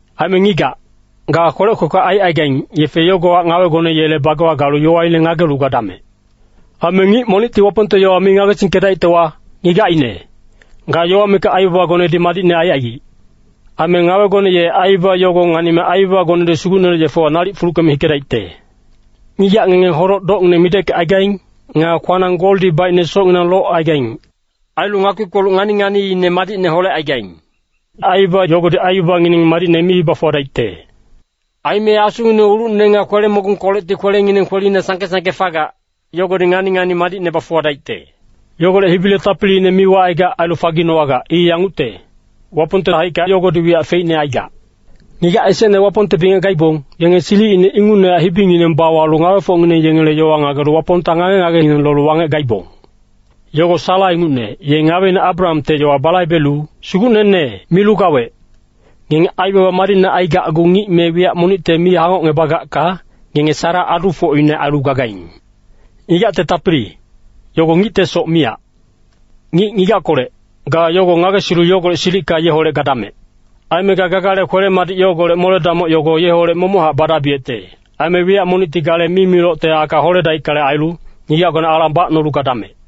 Aime ngigac, ga kwelec kwekwe aicaigaing, yefe yogohac ngawegone yele bagewa galu yowaine ngagelu gadamec. Aime ngic monicti Wapongte yowa mi ngagesingkedaictewa, ngigacine, ga yowa mikac aibabagonedi madicne aicaigic. Aime ngawegone ye aibaba yogo nganime aibabagonedi Sugucnele yefewa nalic fuluckeme hikedaicte. Ngigac ngenge hodoc-dowecngineng mideckecaigaing. Nga kwanang goldi baicne socnginang locaigaing. Ailu ngakpi-kpoluc ngani-nganiine madicne holecaigaing. Aibaba yogodi aibabangineng madicne mi bafuwadaicte. Aime asungineng ulucne nga kwele-mogungkolecti kwelengineng kwelina sangke-sangke fagac, yogodi ngani-ngani madicne bafuwadaicte. Yogolec hibile tapiliine mi wacaigac ailu faginowagac. I yangucte, Wapongte haicka yogodi wiyac feicne aigac. Ngigac esecne Wapongte bingec gaibong, yenge silicine ingucnehac hibingineng bawalu ngawefocngineng yengele yowa ngagelu Wapongta ngage-ngagengineng lolu wangec gaibong. Yogo Sara ingucne, ye ngaweine Abrahamte yowa balaibelu “sugucnene” milu gawec. Ngenge aibaba madicne aigacgu ngic me wiyac monicte mi hangocngebagacka, ngenge Sara adufocine ailu gagaing. Ngigacte tapili, yogo ngictesoc miyac. Ngic ngigackolec, ga yogo ngagesilu yogolec silicka yeholec gadamec. Aime ga gagale kwele-madic yogolec mole-damoc yogo yeholec momochac badabiyecte. Aime wiyac monicti gale mimilocte aka holedaickale ailu, ngigacgone alang bacnolu gadamec.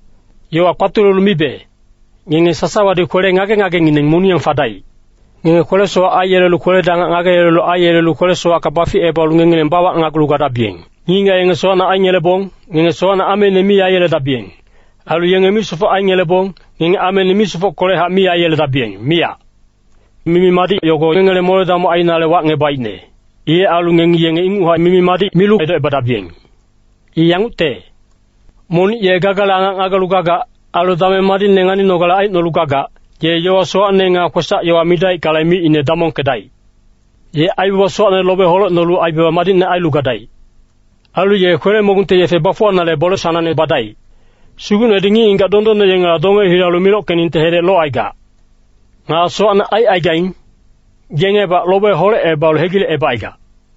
Yowa kpatulelu mibe, ngenge sasawadi kwele ngage-ngagengineng moniyang fadaic. Ngenge kwele-sowac aiyelelu kweledi angac ngagelu aiyelelu kwele-sowacka baficebalu ngengileng bawacnagulu gadabiyeng. Ngic-ngigac yenge sowacne aingelebong, ngenge sowacne ameine mi aiyeledabiyeng. Ailu yenge misofoc aingelebong, ngenge ameine misofockolechac mi aiyeledabiyeng, miyac. Mimi-madic yogo ngengele mole-damoc ainale wacngebaicne. Ilec ailu ngengi yenge inguchac mimi-madic milu edocebadabiyeng. I yangucte, “Monic ye gagale angac ngagelu gagac, ailu dameng madicne nganinogale aicnolu gagac, ye yowa sowacne nga kwesac-yowa midaickale, micine damongkedaic. Ye aibaba sowacne lobe holecnolu aibaba madicne ailu gadaic. Ailu ye kwele-mogungte yefe bafuwanale bole sanangne badaic. Sugucnedi ngic-ngigac dondonne yengela donge hilalu mimilocnginengte hedec locaigac. Nga sowacne aicaigaing, yengebac lobe holecebalu hegilecebacaigac.”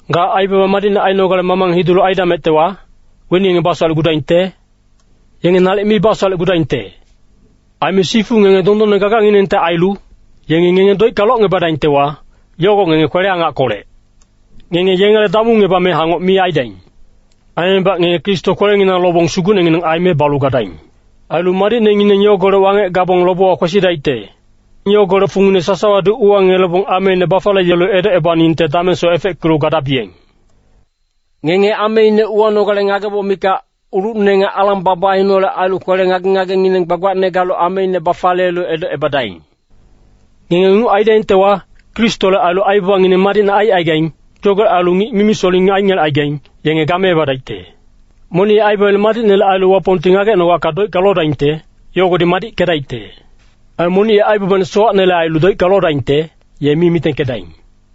Ga aibaba madicne ainogale mamang hidulu aidamectewa, weni yengi basowalecgudaingte? Yenge nalic mi basowalecgudaingte. Aime sifu ngenge dondonne gaganginengte ailu, yengi ngenge doicka locngebadaingtewa, yogo ngenge kwele-angackolec. “Ngenge yengele damungebame hangoc mi aidaing.” Aimebac ngenge Kristo kwelenginang lobong Sugucnengineng aime balu gadaing. Ailu madicnengineng yogolec wangec gabong lobewa kwesidaicte, yogolec fungine sasawadi uwangelebong ameine bafaliyelu edocebaningte damengsoc efeckelu gadabiyeng. Ngenge ameine uwanogale ngageboc mikac, ulucne nga alang babaineholec ailu kwele ngage-ngagengineng gbagbacne galu ameine bafaliyelu edocebadaing. Ngenge inguc aidaingtewa, Kristole ailu aibabangineng madicne aicaigaing. Yogolec ailu ngic mimi-soling aingelecaigaing, yenge gameebadaicte. Monic ye aibabaine madicnele ailu Wapongti ngagecnogacka doicka lodaingte, yogodi madickedaicte. Aime monic ye aibabaine sowacnele ailu doicka lodaingte, ye mi mitengkedaing.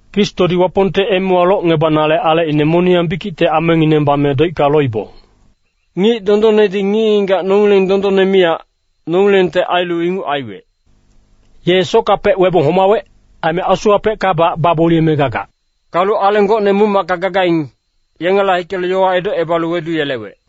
Kristodi Wapongte emewa locngebanale alecine moniyang bikicte amengineng bame doicka loibong. Ngic dondonnedi ngic-ngigac nongileng dondonne miyac, nongilengte ailu inguc aiwec. Ye sockapec webong homawec, aime asuwapeckabac bagboliyeme gagac. Galu aleng gocne muc-macka gagaing, yengela hikelu yowa edocebalu weduyelewec.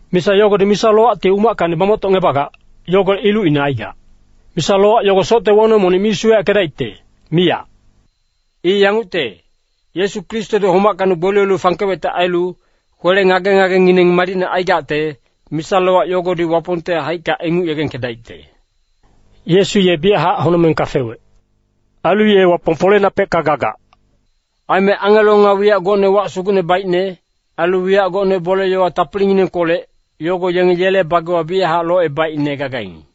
Misa yogodi Misa-lowacti umackacni bamoctocngebagac, yogolec ilucine aigac. Misa-lowac yogo socte wonong monic mi suweyackedaicte, miyac. I yangucte, Yesu Kristodi homackacni gboliyelu fangkewecte ailu, kwele ngage-ngagengineng madicne aigacte, misa-lowac yogodi Wapongte haicka inguc yegengkedaicte. Yesu ye biyachac honocmengka fewec. Ailu ye Wapong foleinapecka gagac. Aime angelo nga wiyac gocne wac sugucne baicne, ailu wiyac gocne bole-yowa tapilinginengkolec, yogo yenge yele bagewa biyachac locebaicne gagaing.